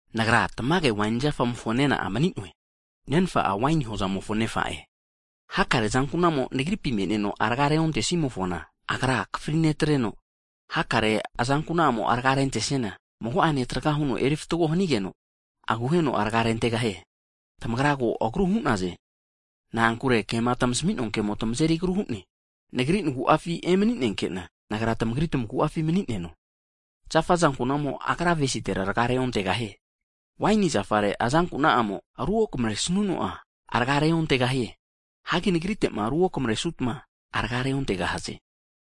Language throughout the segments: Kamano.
Nagra tamage waini zafamofo nena'a mani'noe. Nenfa'a waini hozamofo nefa'e. Hakare azankuna'amo Nagripi me'neno rga reontesimofona, Agra akafri netreno, hakare azankuna'amo rga rentesiana, mago'ene traga huno eri fatgo hanigeno, aguheno rga rentegahie. Tamagra ko agru hu'naze, na'ankure kema tmasmi'noa kemo tmazeri agru hu'ne. Nagri nagu'afi emaninenke'na, Nagra tmagri tmagu'afi mani'neno. Zafa azankuna'amo agra avesitera rga'a reontegahie, waini zafare azankuna'amo ru okamre snuno'a rga reontegahie. Hagi Nagrite'ma ruokamare'sutma rga'a reontegahaze.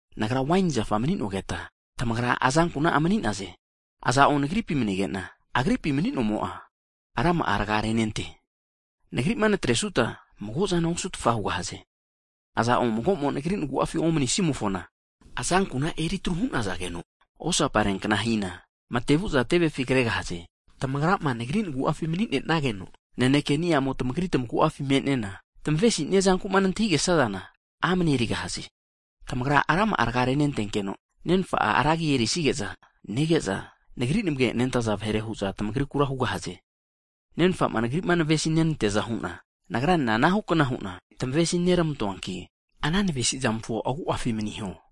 Nagra waini zafa mani'nogeta, tamagra azankuna'a mani'naze. Iza'o Nagripi manige'na agripi mani'nomo'a, rama'a rga renente, Nagri'ma natresuta mago'zana osu'tfa hugahaze. Mago'mo vahe'mo'ma Nagri nagu'afi omnisimofona, azankuna eritru hu'nazageno osaparea kna hina, mate vu'za tevefi kregahaze. Tamagrama, Nagri nagu'afi mani'ne'nageno, naneke ni'amo tamagri tmagu'afi me'nena, tmesinia zankuma nantahigesazana amne erigahaze. Tamagra rama'a rga renentenkeno, Nenfa'a ra agi erisige'za nege'za, Nagri namage nentaza disaipol vahere hu'za tamagrikura hugahaze. Nenfa'ma, Nagri'ma navesi nante'neaza hu'na, Nagranena anahu kna hu'na tmesi nermantoanki, ana navesimofo agu'afi maniho.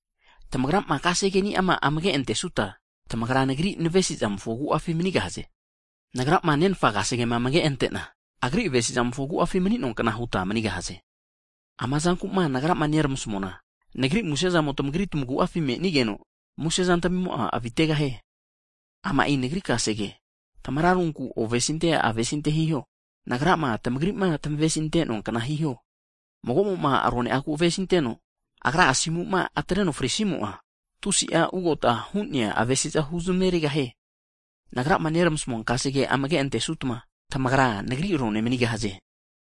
Tamagrama kasege ni'ama amage' antesuta, tamagra Nagri navesimofo agu'afi manigahaze, Nagrama, Nenfa kasegema amage ante'na, Agri avesizamofo agu'afi mani'noankna huta manigahaze. Ama zanku'ma Nagra nermasmuana, Nagri muse zamo tmagri tmagu'afi me'nigeno, musezantmimo'a avitegahie. Ama'i Nagri kasege, tmararunku ovesinte, avesinte hiho, Nagrama, tmagri'ma navesi tmante'noa kna hiho. Mago'mo'ma rone'agu avesinteno, agra asimuma atreno frisimo'a, tusi'a ugota hu'nea avesiza huzmerigahie. Nagrama neramasmua kasegema amage antesutma Tamagra, Nagri rone manigahaze.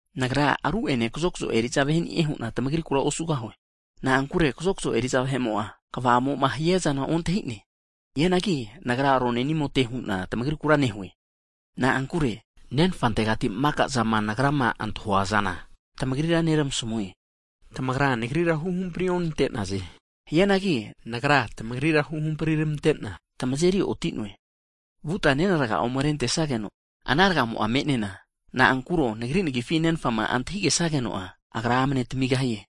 Nagra ru'ene kazokzo eri'za vahe'ni'e hu'na tmagrikura osugahue, na'ankure kazokzo eri'za vahe'mo'a kva'amo'ma hiazana ontahi'ne. Hianagi Nagra rone'nimote hu'na tmagrikura nehue, na'ankure Nenfantegati maka'zama Nagrama antahuazana, tmagrira neramasmue. Tamagra, Nagrira huhampri'onante'naze, hianagi Nagra, tmagrira huhampritamantena, tmazeri oti'noe, vuta nena rga'a ome rentesageno, ana rgamo me'nena, na'ankuro Nagri nagifi Nenfama antahigesageno'a, Agra amne tmigahie.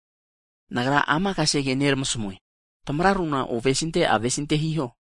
Nagra ama kasege neramasmue, tmararuna ovesinte avesinte hiho.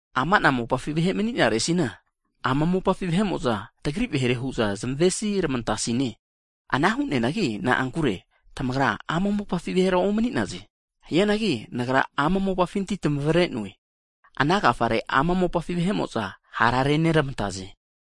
Ama'na mopafi vahe mani'naresina, ama mopafi vahe'mo'za tagri vahere hu'za zamesi rmantasine, ana hu'neanagi na'ankure tamagra ama mopafi vahera omni'naze. Hianagi Nagra ama mopafinti tmagrira tmavre'noe, ana agafare ama mopafi vahe'mo'za hara reramantegahaze.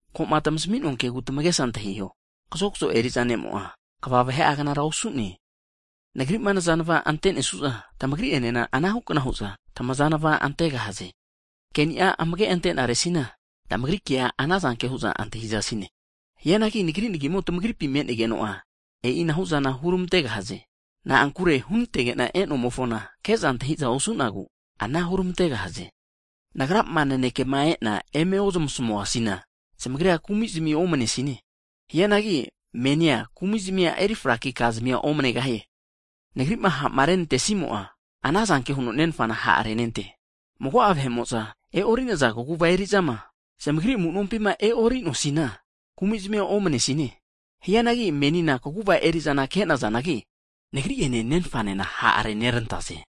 Ko'ma tmasmi'noa kegu tamagesa antahiho, kazokzo eri'za ne'amo'a, kva vahe'a knara osu'ne. Nagri'ma nazanva ante'nesu'za, tamagri enena anahu kna hu'za tmazanva antegahaze, ke'ni'a amage antenare'sina, tmagri kea ana zanke hu'za antahizasine. Hianagi Nagri nagimo tmagripi me'nenigeno'a, e'ina hu'zana hurmantegahaze, na'ankure hunantege'na e'nomofona ke'za antahi'za osu'nagu ana hurmategahaze. Nagrama naneke e'na eme ozmasmuasina, zamagrira kumi'zmi omne sine. Hianagi menina kumi'zmia eri fraki ka zamia omnegahie. Nagri'ma ha'ma renantesimo'a, ana zanke huno Nenfana ha' renente. Mago'a vahe'mo'za e'orinaza kaguva eri'zama zamagri amu'nompi e'ori'noasinia, kumi'zmia omnesine. Hianagi menina kaguva eri'zani'a kazanagi, Nagri'ene Nenfanena ha' renerantaze.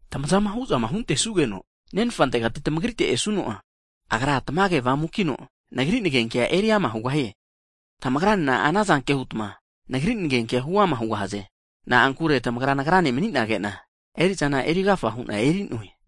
Tmazama hu'zama huntesugeno Nenfantegati tmagrite esuno'a, Agra Tmage Avamukino Nagri nagenkea eriama hugahie. Tamagranena ana zanke hutma Nagri nanekea huama hugahaze, na'ankure tamagra Nagrane mani'nage'na, eri'zana eri agafa hu'na eri'noe.